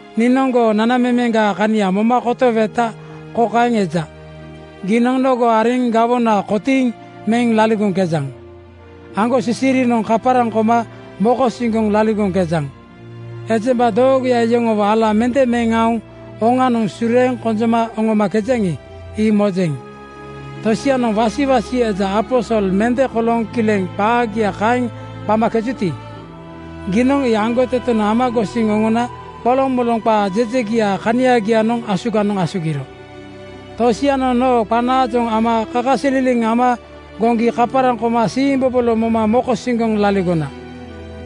Niinoŋ goo nanamemeŋgaa kania moma kotoweta kokaeŋ eja: Giinoŋ nogo ariŋ gawona kotiiŋ meŋ laligoŋkejaŋ. Aŋgosisirinoŋ kaparaŋ koma mokosiŋgoŋ laligoŋkejaŋ. Ejemba doogoya yoŋowo ala mende meŋ aoŋ oŋanoŋ sureeŋ konjoma oŋomakejaŋi, ii mojeŋ. Tosianoŋ wasiwasi eja aposol mende kolooŋ kileŋ qagia kaeŋ qamakejuti, giinoŋ ii aŋgotetenoŋ ama gosiŋ oŋona qolomoloŋ qaa jejegiaa kaniagianoŋ asuganoŋ asugiro. “Tosianoŋ noo qanaajoŋ ama kakasililiŋ ama goŋgi kaparaŋ koma siimbobolo moma mokosiŋgoŋ laligona.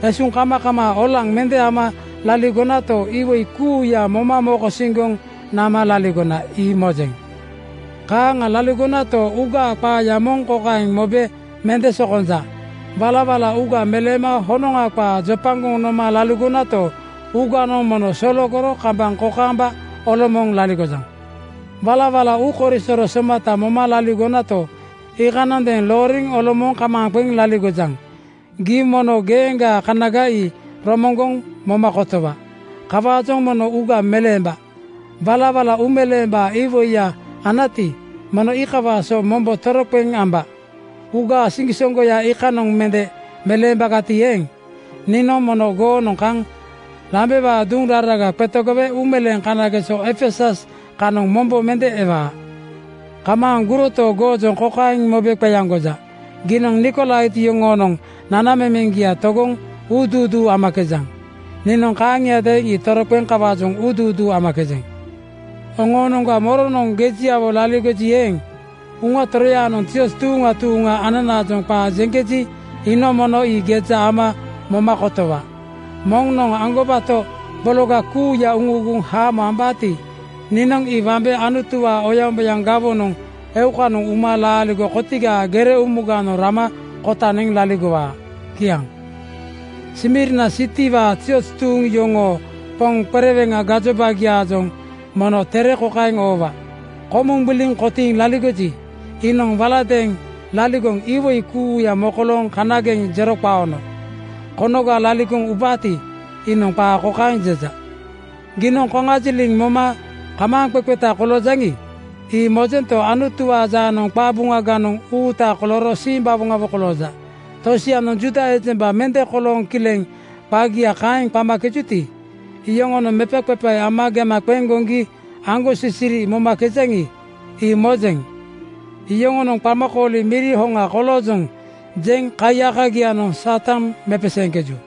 Esuŋkamakamaa olaŋ mende ama laligonato, iwoi kuuya moma mokosiŋgoŋ nama laligona, ii mojeŋ. Kaaŋa laligonato, uugaa qaaya moŋ kokaeŋ mobe mende sokonja: Walawala uuga meleema honoŋa qaa jopagoŋ noma laligonato, uuganoŋ mono sologoro kambaŋ kokaamba olomooŋ laligojaŋ. “Walawala uukoisoro somata moma laligonato, iikanoŋadeeŋ looriŋ olomooŋ kamaaŋ qeŋ laligojaŋ. Gii mono geeŋgaa kanaga ii romoŋgoŋ moma kotowa. Kawaajoŋ mono uuga meleemba. Walawala uumeleembaa iwoiya anati, mono iikawaa so mombo toroqeŋ amba. Uuga siŋgisoŋgoya iikanoŋa mende meleembagati eeŋ, niinoŋ mono goonoŋ kaŋ lambewaa duŋ raraga qetegowe uumeleeŋ kanageso Efesus kanoŋ mombo mende ewaa. Kamaaŋ guroto, goojoŋ kokaeŋ mobe qeaŋgoja: Giinoŋ Nikolait yoŋoonoŋ nanamemeŋgia togoŋ uuduuduu amakejaŋ. Niinoŋ kaaŋiadeeŋ ii togoŋ kawaajoŋ uuduuduu amakejeŋ. “Oŋoonoŋga moronoŋ gejiawo laligoji eeŋ, Uŋa Toroyanoŋ zioz tuuŋa tuuŋa ananaajoŋ qaa jeŋkeji, iinoŋ mono ii geja ama moma kotowa. “Moŋnoŋ aŋgobato bologa kuuya uuguŋ haamo ambaati, niinoŋ ii wambe Anutuwaa oyaŋboyaŋ gawonoŋ (paradais) eukanoŋ uma laaligo kotigaa gere umuganoŋ rama kota neŋ laligowaa.” Kiaŋ. “Smirna sitiwaa zioz tuuŋ yoŋoo poŋ qereweŋa gajobagiaajoŋ mono tere kokaeŋ oowa, “Komuŋ gbiliŋ kotiiŋ laligoji, iinoŋ waladeeŋ laligoŋ (iwoi kuuya mokolooŋ kanageŋ jero qaono) konoga laligoŋ ubaati, iinoŋ qaa kokaeŋ jeja: Giinoŋ koŋajiliŋ moma kamaaŋqeqeta koloojaŋi, ii mojento, Anutuwaa jaanoŋ qabuŋaganoŋ uuta kolooro simbawoŋawo koloojaŋ. Tosianoŋ Juuda ejemba mende kolooŋ kileŋ qagia kaeŋ qamakejuti, iyoŋonoŋ mepaqepae ama gema qeŋ goŋgi aŋgosisiri momakejaŋi, ii mojeŋ. Yoŋonoŋ ‘Qamakooli miri hoŋa koloojoŋ,’ jeŋ kaiyakagianoŋ Satan mepeseeŋkeju.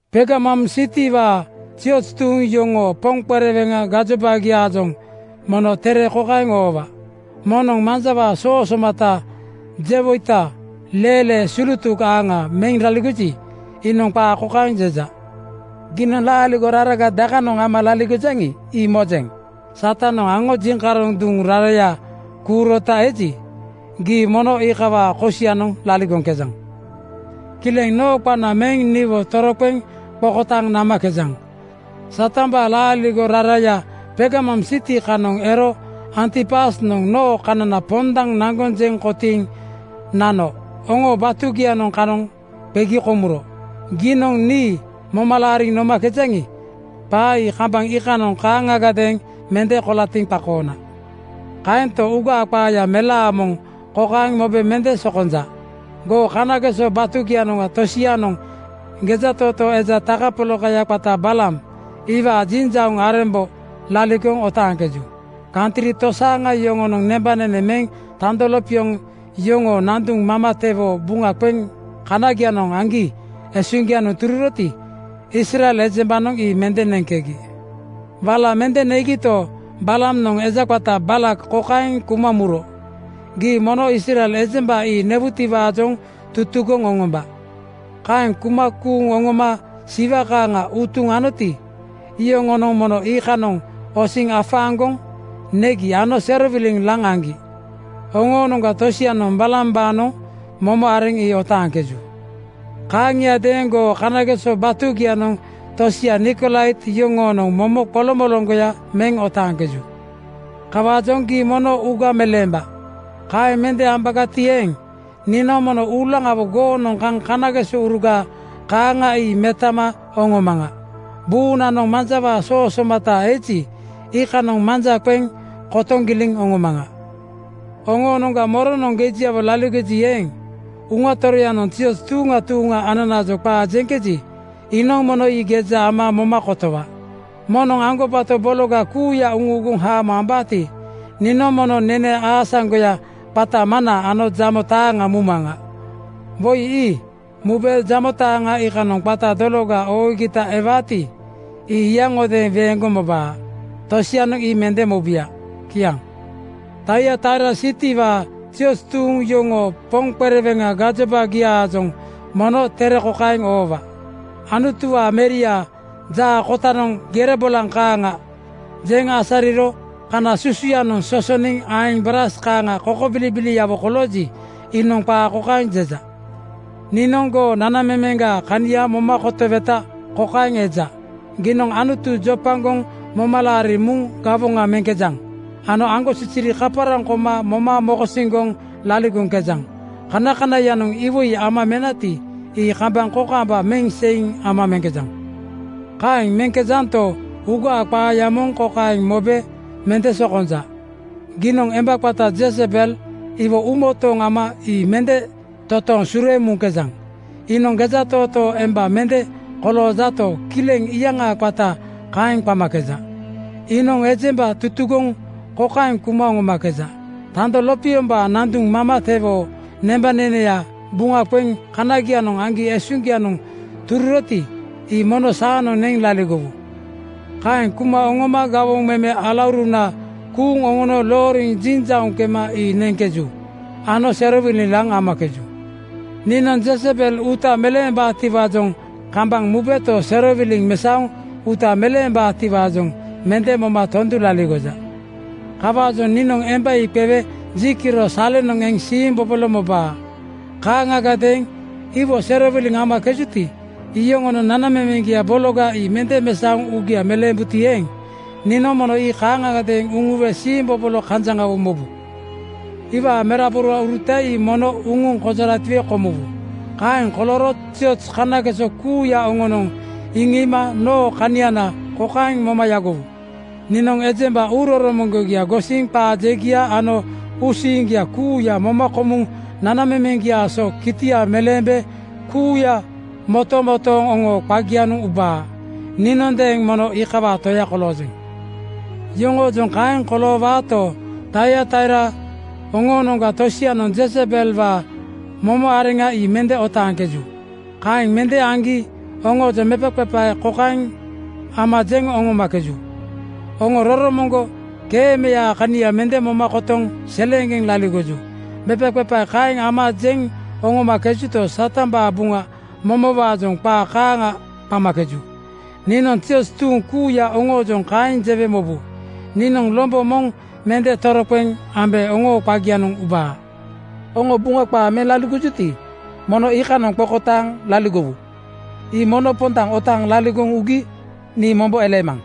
“Pergamum sitiwaa zioz tuuŋ yoŋoo poŋ qereweŋa gajobagiaajoŋ mono tere kokaeŋ oowa, “Moŋnoŋ manjawaa soo somata (bainat) jewoita leelee sulutuk aaŋa meŋ laligoji, iinoŋ qaa kokaeŋ jeja: Giinoŋ laaligo raraga dakanoŋ ama laligojaŋi, ii mojeŋ. Satanoŋ aŋo jiŋkaroŋ duŋ raraya kuurota eji, gii mono iikawaa kosianoŋ laligoŋkejaŋ. Kileŋ noo qana meŋ niwo toroqeŋ qokotaaŋ namakejaŋ. Satambaa laaligo raraya Pergamum siti kanoŋ ero Antipasnoŋ noo kanana pondaŋ naŋgoŋ jeŋ kotiiŋ nano oŋoo batugianoŋ kanoŋ qegi komuro. Giinoŋ nii moma laariŋ nomakejaŋi, qaa ii kambaŋ iikanoŋ kaaŋagadeeŋ mende kolatiŋ qakoona. “Kaento, uugaa qaaya melaa moŋ kokaeŋ mobe mende sokonja: Goo kanageso batugianoŋ tosianoŋ gejatootoo eja takapolakaya qata Balaam iwaa jinjauŋ arembo laligoŋ otaaŋkeju. Kantri tosaaŋa yoŋonoŋ nembanene meŋ tando lopioŋ yoŋoo nanduŋ mamatewoo buŋa qeŋ kanagianoŋ aŋgi esuŋgianoŋ tururoti, Israel ejembanoŋ ii mende neŋkegi. Wala mende negito, Balaamnoŋ eja qata Baalak kokaeŋ kuma muro, ‘Gii mono Israel ejemba ii newutiwaajoŋ tutugoŋ oŋomba.’ Kaeŋ kuma kuuŋ oŋoma siwa kaaŋa utuŋ anoti, iyoŋonoŋ mono iikanoŋ osiŋ afaaŋgoŋ negi ano serowiliŋ laŋ aŋgi. Oŋoonoŋga tosianoŋ Balaambaanoŋ momo areŋ ii otaaŋkeju. “Kaaŋiadeeŋ goo kanageso batugianoŋ tosia Nikolait yoŋoonoŋ momo qoloŋmoloŋgoya meŋ otaaŋkeju. Kawaajoŋ gii mono uuga meleemba. Kaeŋ mende ambagati eeŋ, niinoŋ mono uulaŋawo goonoŋ kaŋ kanagesouruga kaaŋa ii metama oŋomaŋa. Buunanoŋ manjawaa soo somata (bainat) eji, iikanoŋ manja qeŋ kotoŋ giliŋ oŋomaŋa. “Oŋoonoŋga moronoŋ gejiawo laligoji eeŋ, Uŋa Toroyanoŋ zioz tuuŋa tuuŋa ananaajoŋ qaa jeŋkeji, iinoŋ mono ii geja ama moma kotowa. “Moŋnoŋ aŋgobato bologa kuuya uuguŋ haamo ambaati, niinoŋ mono nene aasaŋgoya qata mana ano jamo taaŋa mumaŋa. Woi ii mube jamo taaŋa iikanoŋ qata dologa oogita ewaati, ii yaŋodeeŋ weeŋgoŋ mobaa. Tosianoŋ ii mende mobuya.” Kiaŋ. “Taiataira sitiwaa zioz tuuŋ yoŋoo poŋ qereweŋa gajobagiaajoŋ mono tere kokaeŋ oowa: “Anutuwaa Meriaa jaa kotanoŋ gere bolaŋ kaaŋa jeŋ asariro kana susuyanoŋ sosoniŋ aeŋ braas kaaŋa kokobilibiliawo kolooji, iinoŋ qaa kokaeŋ jeja: Niinoŋ goo nanamemeŋgaa kania moma kotoweta kokaeŋ eja: Giinoŋ Anutu jopagoŋ moma laariŋ muŋ gawoŋa meŋkejaŋ ano aŋgosisiri kaparaŋ koma moma mokosiŋgoŋ laligoŋkejaŋ. Kanakanaiyanoŋ iwoi ama menati, ii kambaŋ kokaamba meŋ seiŋ ama meŋkejaŋ. “Kaeŋ meŋkejanto, uugaa qaaya moŋ kokaeŋ mobe mende sokonja: Giinoŋ emba qata Jezebel iwo uumotooŋ ama ii mende totooŋ sureeŋ muŋkejaŋ. Iinoŋ gejatootoo emba mende koloojato, kileŋ iyaŋaa qata kaeŋ qamakeja. Iinoŋ ejemba tutugoŋ kokaeŋ kuma oŋomakeja: Tando lopiombaa nanduŋ mamatewoo nembaneneya buŋa qeŋ kanagianoŋ aŋgi esuŋgianoŋ tururoti, ii mono saanoŋ neŋ laligowu. Kaeŋ kuma oŋoma gawoŋ meme alauruna kuuŋ oŋono looriŋ jinjauŋ kema ii neŋkeju ano serowiliŋ laŋ amakeju. Niinoŋ Jezebel uuta meleembaatiwaajoŋ kambaŋ mubeto, serowiliŋa mesaoŋ uuta meleembaatiwaajoŋ mende moma tondu laligoja. “Kawaajoŋ niinoŋ emba ii qewe ji kiro salenoŋ eŋ siimbobolo mobaa. Kaaŋagadeeŋ iwo serowiliŋ amakejuti, iyoŋonoŋ nanamemeŋgia bologa ii mende mesaoŋ uugia meleembuti eeŋ, niinoŋ mono ii kaaŋgadeeŋ uŋuwe siimbobolo kanjaŋawo mobu. Iwaa meraborauruta ii mono uŋuŋ konjoratiwe komuwu. Kaeŋ kolooro zioz kanageso kuuya oŋonoŋ iŋiima noo kaniana kokaeŋ moma yagowu: Niinoŋ ejemba uuroromoŋgia gosiŋ qaa jegia ano uusiiŋgia kuuya moma komuŋ nanamemeŋgiaa so kitia meleembe kuuya motomotooŋ oŋoo qagianoŋ ubaa. Niinondeeŋ mono iikawaa Toya koloojeŋ. “Yoŋoojoŋ kaeŋ koloowaato, Taiataira oŋoonoŋga tosianoŋ Jezebelwaa momo areŋa ii mende otaaŋkeju. Kaeŋ mende aŋgi oŋoojoŋ mepaqepae kokaeŋ ama jeŋ oŋomakeju, ‘Oŋo roromoŋgo keemeyaa kania mende moma kotoŋ seleeŋgeŋ laligoju.’ Mepaqepae kaeŋ ama jeŋ oŋomakejuto, Satambaa buŋa momowaajoŋ qa kaaŋa qamakeju. Niinoŋ zioz tuuŋ kuuya oŋoojoŋ kokaeŋ jewe mobu: Niinoŋ lombo moŋ mende toroqeŋ ambe oŋoo qagianoŋ ubaa. Oŋo Buŋa qaa meŋ laligojuti, mono iikanoŋ qokotaaŋ laligowu. Ii mono pondaŋ otaaŋ laligoŋ ugi nii mombo eleemaŋ.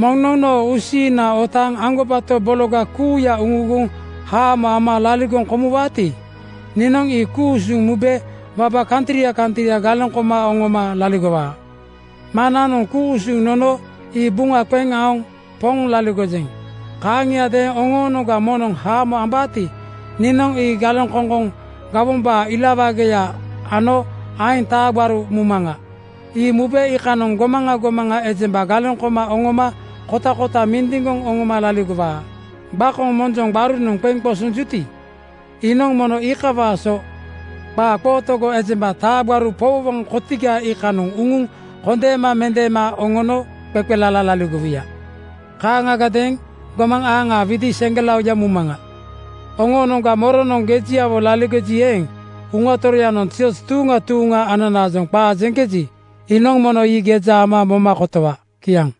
“Moŋnoŋ noo uusiiŋna otaaŋ aŋgobato bologa kuuya uuguŋ haamo ama laligoŋ komuwaati, niinoŋ ii ku-usuŋ mube waba kantria kantria galeŋ koma oŋoma laligowaa. Maŋnanoŋ ku-usuŋ nono ii buŋa qeŋ aoŋ Poŋ laligojeŋ. Kaaŋiadeeŋ oŋoonoŋga moŋnoŋ haamo ambaati, niinoŋ ii galeŋkoŋkoŋ gawombaa ila wageya ano aeŋ taa gbaruya mumaŋa. Ii mube iikanoŋ gomaŋa gomaŋa ejemba galeŋ koma oŋoma kotakota mindiŋgoŋ oŋoma laligowaa. Gbakoŋ monjoŋ gbarunoŋ qeŋ qosonjuti, iinoŋ mono iikawaa so qaa qootogo ejemba taa gbaru powowoŋ kotiga iikanoŋ uŋuŋ kondeema mendeema oŋono qeqelala laligowuya. Kaaŋagadeeŋ gomaŋ aaŋaa widi seŋgelaoya mumaŋa. “Oŋoonoŋga moronoŋ gejiawo laligoji eeŋ, Uŋa Toroyanoŋ zioz tuuŋa tuuŋa ananaajoŋ qaa jeŋkeji, iinoŋ mono ii geja ama moma kotowa.” Kiaŋ.